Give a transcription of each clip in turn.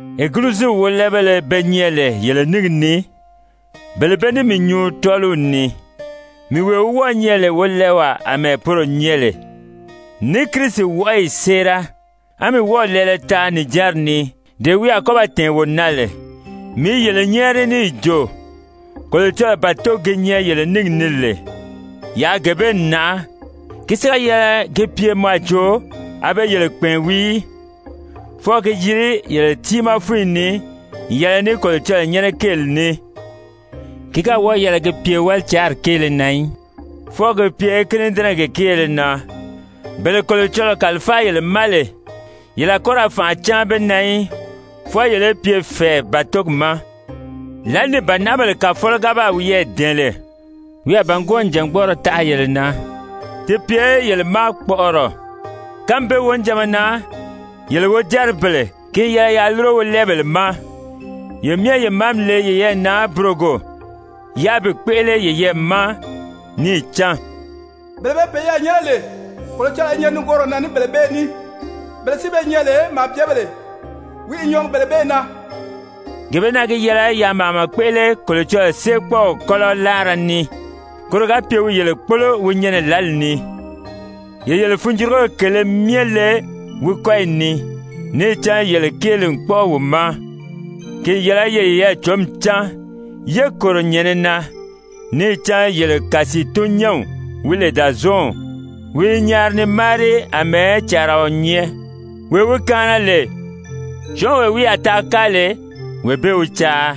Egiliziw wólɛɛbéle be nyɛ lè yele níngi ni, bele bee ní mii nyuu tɔ́ɔliw ni, mii wee wi wɔ́ɔ̄ nyɛ lè wolɛɛwaa àmɛɛ poro nyɛ lè, ní Kirisi wɔʔɔyi séera, á mii wɔ́ɔ̀ lɛɛlɛ taa nìjanri ni, dee wi a kɔ́ ba tɛ̀ɛn wo na lè, mii i yele nyɛ́ɛri níì jo: Kolocɔlɔɔ bàtogi gi nyɛ yele níngi ni lè, yaa gee bee nàʔá. Ki si ga yɛlɛ gi pye mɔ a jo a be yele kpɛ̀ɛn wii í, fwɔɔ ki yiri yele tiimaa fúnyi ni n yɛlɛ ní Kolocɔlɔɔ nyɛ́nɛ kéeli ní. Ki ga wɔ́ɔ̀ yɛlɛ gi pye wálicaari kéele na í, fwɔɔ gi pye kínidɛnɛgi kéele na. Bele Kolocɔlɔɔ kàlifáa yele ma lè yele a kɔ́ ra fànʔa cáan be na í, fwɔɔ yele í pye fɛ̀ɛ bàtogi ma. Lǎli ni bànaʔabèle Kàfɔlɔ ga baa wiyɛɛ dɛ̀ɛn lè, wi a bàngwɔɔ nìjangbɔɔrɔ taʔa yele na, ti pye yele ma kpɔʔɔrɔ. Kánmi bee wonijanma na, yele wojáribèle, ki n yɛlɛ yaa lúro wolɛɛbèle ma. Ye myɛ ye màámi le yeyɛɛ na burogo, yáā bi kpéʔele yeyɛɛ ma, níì cán «Bele be peyɛɛ nyɛ́nɛ lè, Kolocɔlɔɔ i nyɛ nigooro na ní bele bee ní, bele si be nyɛ lè, màabyebèle, wi i nyɔɔgi bele bee na.» Gee bee na gi yɛlɛ yaa màama kpéʔele Kolocɔlɔɔ séekpɔɔw kɔ́lɔ láara ni, koro ga pye wi yele kpólo wi nyɛnɛ lǎli ni. Ye yele funjurugori kèlē myɛ le wi kɔ́yi ni, níì cán yele kéeli n kpɔ́ʔɔ wi ma. Ki n yɛlɛ ye yeyɛɛ cǒmi cán, yé kòro nyɛ̀nɛ na! Níì cán yele kàsiitun-nyɛ́nw wi lè Dàzɔɔnw, wi i nyaari ni máari àmɛɛ càaraɔ nyɛ, wee wi kaana lè, syɔ́ɔnwee wi a taa káa lè, wee bee wi caa.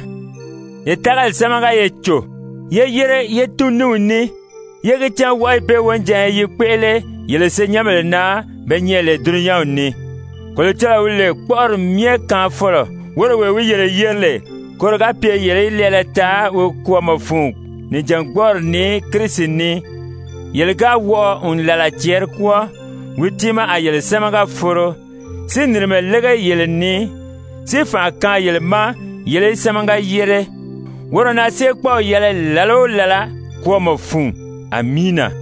Ye tágali sámaga ye cò, yé yére ye tún ní wi ní, yé gi cán wɔʔɔyi bee wonijanya i kpéʔele yele senyɛnbèle na be nyɛ lè dulunyanw ni. Kolocɔlɔɔ wi lè kpɔ́ʔɔri myɛ kaanfɔlɔ, woro wee wi yele yeri lè koro ga pye yele í lɛɛlɛ taa wi kwɔ́ɔmɔ fun nijangbɔɔri ni Kirisi ni, yele ga wɔʔɔ n làla cɛɛri kwɔ́ɔ, wi tiimaa a yele sámaga foro, si nìrimɛ lége yele ni, si fànʔa kaan yele ma yele í sámaga yére. Woro na séekpɔɔw yɛlɛ làla o làla kwɔ́ɔmɔ fun! Amiina!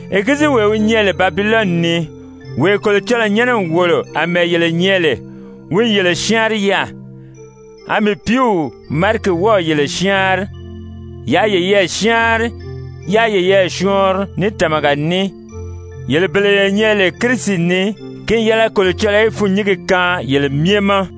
Egiliziwee wi nyɛ lè Babilɔni ni, wee Kolocɔlɔɔ nyɛ́nɛ n wòlo àmɛɛ yele nyɛ lè, wi n yele syáanri yaà, a mii pìíw Mariki wɔ́ɔ̀ yele syáanri. Yaa yeyɛɛ syáanri, yáā yeyɛɛ syɔɔnri ní tàmaga ní. Yele bele ye nyɛ lè Kirisi ni, ki n yɛlɛ Kolocɔlɔɔ í fûnnyingi kaan yele myɛ ma!